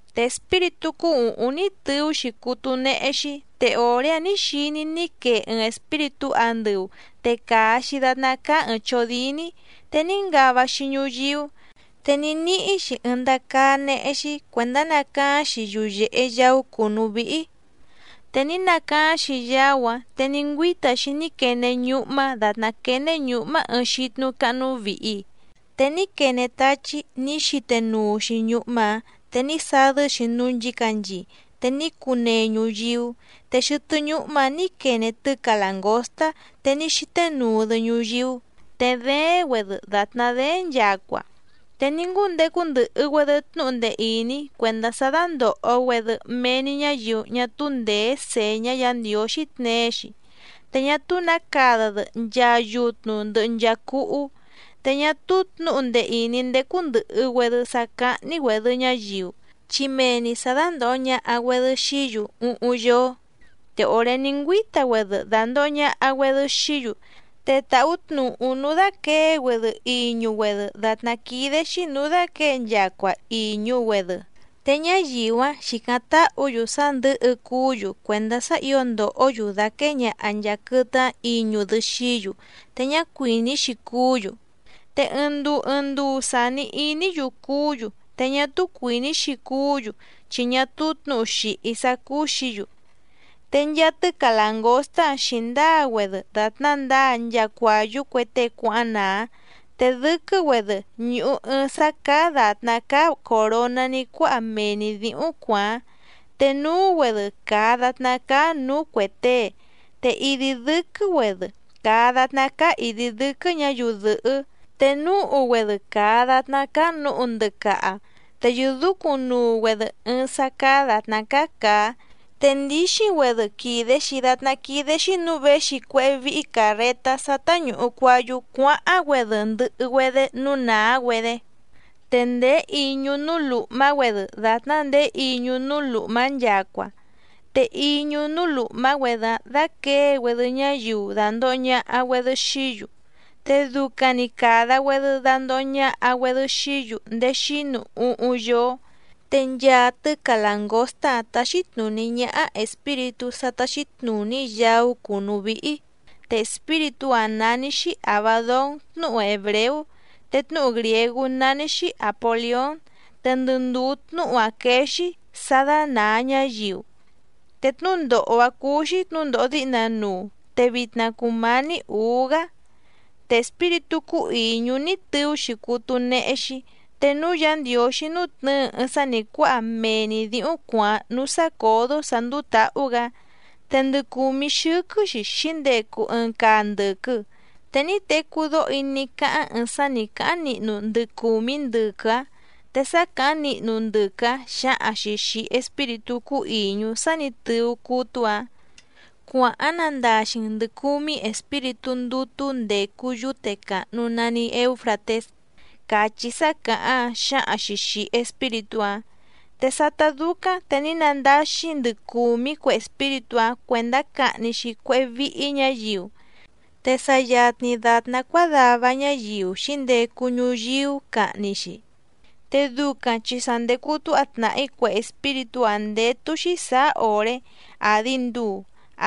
Te espíritú cúú ùhúⁿ ní tɨú‑xi cútú néhé‑xí, te òré‑áⁿ nǐ xiní‑í ní quee ɨɨⁿ espíritú andɨu te càa‑xi datná cáá ɨ̀ɨⁿ chódíní, te ní ngava‑xi ñuyíú, te ní níhí‑xi ɨɨⁿ ndacaá néhé‑xí cuèndá nacaáⁿ‑xi yuyèhe yaú cùnú víhí. Te ní nacaáⁿ‑xi yaú‑áⁿ te ní ngüíta‑xi ní quene ñúhmá dàtná quéné ñǔhmá ɨɨⁿ xítnú cáhnú vìhi, te ní quene táchí nǐ xíténuu‑xi ñúhmá‑ǎⁿ te ní sadɨ́‑xi núú nchǐcanchii, te ní cunee ñuyíú. Te xɨtɨ́ ñúhmá‑ǎⁿ nǐ quene tɨ́ca làngóstá, te ní xíténuu‑dɨ ñuyíú, te dééⁿ‑güedɨ dàtná dééⁿ nchacua. Te ní ngúndecu ndɨhɨ‑güedɨ tnúhu ndee ìní cuèndá sá dándòho‑güedɨ mee‑ni ñáyiu ñá túú ndèé sèñá Yǎ Ndiǒxí tneé‑xi, te ñá túú nǎ cada‑dɨ nchaa yutnu ndɨhɨ nchaa cúhú. Te ñá túú tnǔhu ndee ìní ndécú ndɨ̀hɨ‑güedɨ sá cáhní‑güèdɨ ñáyiu, chi mee‑ni sǎ dándòho ñaha‑güedɨ xií‑yu úhúⁿ yóó. Te òré ní ngüíta‑güedɨ dàndoho ñaha‑güedɨ xií‑yu te tàhú tnùhú núú dáquěe‑güedɨ iñu‑güedɨ dàtná quídé‑xí nǔú dáquěe nchacua ìñu‑güedɨ. Te ñáyiu‑áⁿ xìcáⁿ táhǔ‑yu sá ndɨ̌hɨ cuú‑yu cuèndá sá ǐo ndòhó‑yu dàquée ñaha nchàa quɨtɨ‑áⁿ iñu‑dɨ xií‑yu te ñá cuìní‑xi cuú‑yu, te ɨɨⁿ nduu ɨɨⁿ nduu sàni iní‑yu cuú‑yu te ñá túú cuìní‑xi cuú‑yu chi ñá túú tnǔhu xìhí sá cúú‑xǐ‑yu. Te nchaa tɨ́ca làngóstá‑áⁿ xǐndáa‑güedɨ dàtná ndǎa nchaa cuàyú cue tée cuáháⁿ nàá, te dɨ́quɨ́‑güedɨ ñùhu ɨɨⁿ sá cáá dàtná cáá còroná ní cuáha mee‑ni dǐhúⁿ cuàáⁿ, te núú‑güedɨ càa datná cáá nǔú cuè tée. Te idi dɨ́quɨ́‑güedɨ càa datná cáá ìdi dɨ́quɨ́ ñǎyiu dɨ̀hɨ́, te núhu‑güedɨ càa datná cáá nǔhu ndɨcaha. Te yɨ̀dúcúⁿnuu‑güedɨ ɨɨⁿ sá cáá dàtná cáá càá, te ndíxíⁿ‑güedɨ quìde‑xi datná quídé‑xí nǔú věxi cuéhé víhí càrretá sá táñùhu cuayú cuáháⁿ‑güedé ndɨhɨ‑güedɨ núú nàá‑güedé. Te ndèé iñu núú lùhmá‑güedɨ dàtná ndèé iñu núú lùhmá nchacua, te iñu núú lùhmá‑güedɨ‑áⁿ dáquěe‑güedɨ ñáyiu dàndoho ñaha‑güedɨ xií‑yu, te ducaⁿ‑ni càda‑güedɨ dandoho ñaha‑güedɨ xií‑yu ndéé xínu úhúⁿ yóó. Te nchaa tɨ́ca làngóstá‑áⁿ táxí tnùní ñáhá espíritú sá táxí tnùní yaú cùnú víhí, te espíritú‑áⁿ nání‑xí Àbadón tnúhu hèbreú, te tnúhu grìégú nání‑xí Àpolión, te ndɨ ndùú tnúhu‑áⁿ quéé‑xí: Sá dánàa ñáyiu. Te tnúndòho‑a cuu‑xi tnúndòho díhna nuu, te vitna cùmání ǔú‑gá. Te espíritú cúú ìñú ní tɨú‑xi cútú néhé‑xí. Te núú Yǎ Ndiǒxí nútnɨ̌ɨ ɨɨⁿ sá nǐ cuáha mee‑ni dǐhúⁿ cuàáⁿ núú sácǒdó sǎ ndúú tǎhú‑gǎ, te ndɨ cùmí xɨ́quɨ́‑xi xǐndecu ɨɨⁿ caa ndɨ̀quɨ, te ní tecú dóho‑í ní cáháⁿ ɨɨⁿ sá nǐ cáháⁿ nihnu ndɨ cùmí ndɨquɨ‑áⁿ. Te sá càháⁿ nihnu ndɨquɨ‑áⁿ xǎhaⁿ‑xi xìi espíritú cúú ìñú sá nǐ tɨú cútú‑ǎⁿ: —Cuàháⁿ nandaxi‑n ndɨ̀ cumí espíritú ndútú ndècu yúte càhnu nani Eúfratés —càchí sá càháⁿ‑áⁿ xǎhaⁿ‑xi xìi espíritú‑áⁿ. Te sátá dúcáⁿ te ní nandáxí ndɨ cùmí cue espíritú‑áⁿ cuèndá cahni‑xi cuéhé víhí ñǎyiu, te sa yatni dàtná cuádava ñáyiu xǐndecu ñuyíú cahni‑xi, te ducaⁿ chi sa ndècu túha tnàhí cue espíritú‑áⁿ ndétú‑xí sàá òré, àdi nduu,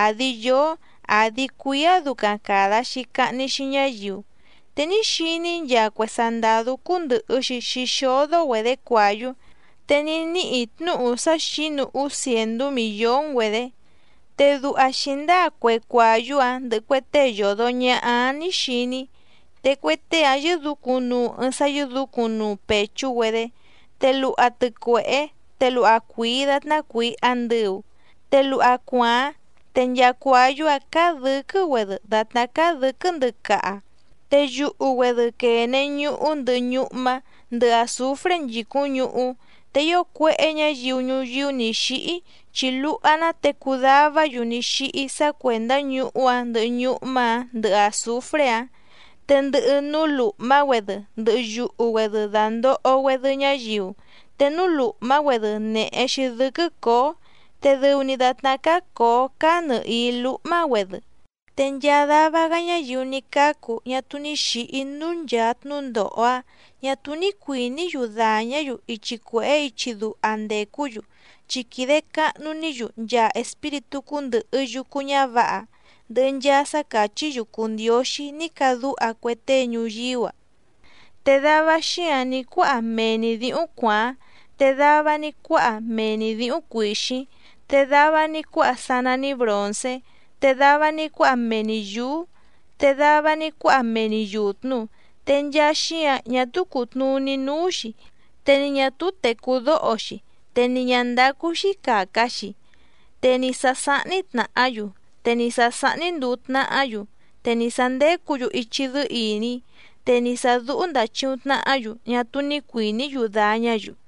àdi yóó, àdi cuíá ducaⁿ càda‑xi cahni‑xi ñáyiu. Te ní xiní‑í nchaa cue sandàdú cúndɨ̀hɨ‑xi xixódó‑güedě cuàyú, te ní níhì‑í tnúhu sá xǐnu úú cièndú mìllón‑güedě. Te duha xǐndáa cue cuàyú‑áⁿ ndɨhɨ cue tée yòdo ñaha‑áⁿ nǐ xiní‑í: Te cue tée‑áⁿ yɨ́dǔcúⁿ nuu ɨɨⁿ sá yɨ́dǔcúⁿnuu pèchú‑güedé, te luha tɨcuèhé te luha cuìi datná cuìi andɨu, te luha cuàáⁿ, te nchaa cuàyú‑áⁿ cáá dɨ̌quɨ́‑güedɨ dàtná cáá dɨ̌quɨ́ ndɨcaha, te yuhu‑güedɨ quène ñuhú ndɨhɨ ñúhmá, ndɨhɨ àzufré nchìcúⁿ ñuhú. Te ío cuéhé ñǎyiu ñuyíú nǐ xíhí chi luha‑ná te cudavá‑yu ní xíhí sá cuèndá ñuhú‑áⁿ ndɨhɨ ñúhmá‑ǎⁿ ndɨhɨ àzufré‑áⁿ. Te ndɨhɨ núú lùhmá‑güedɨ ndɨhɨ yuhu‑güedɨ dàndoho‑güedɨ ñáyiu, te núú lùhmá‑güedɨ nèhe‑xi dɨ́quɨ́ cǒó, te dɨu‑ni dàtná cáá cǒó cáá nɨ̀hií lúhmá‑güedɨ. Te nchaa dava‑gá ñáyiu ní cácu ñá túú ni xǐhí núú nchàa tnúndòho‑áⁿ ñà túú ní cuìní‑yu dàñá‑yu ichi cuèhé ichi duha ndècú‑yu, chi quìde cahnu‑ní‑yu nchaa espíritú cúndɨ̀hɨ yucu ñávǎha, ndɨhɨ nchaa sá càchí‑yu cùu ndióxí ní cadúha cue tée ñuyíú‑a, te dava xíǎⁿ ní cuáha mee‑ni dǐhúⁿ cuàáⁿ, te dava ní cuáha mee‑ni dǐhúⁿ cuìxíⁿ, te dava ní cuáha sá nání bròncé, te dava ní cuáha mee‑ni yǔú, te dava ní cuáha mee‑ni yùtnu, te nchaa xíǎⁿ ñá túú cùtnuní núú‑xi, te ni ñà túú tècú dóho‑xi, te ni ñǎ ndácú‑xí càca‑xi. Te ni sǎ sáhní tnàhá‑yu, te ni sǎ sáhní ndùu tnahá‑yu, te ni sǎ ndécǔ‑yu ichi dɨ́ɨ́ ìní, te ni sà dúhú ndàchiuⁿ tnahá‑yu ñá túú ní cuìní‑yu dàñá‑yu.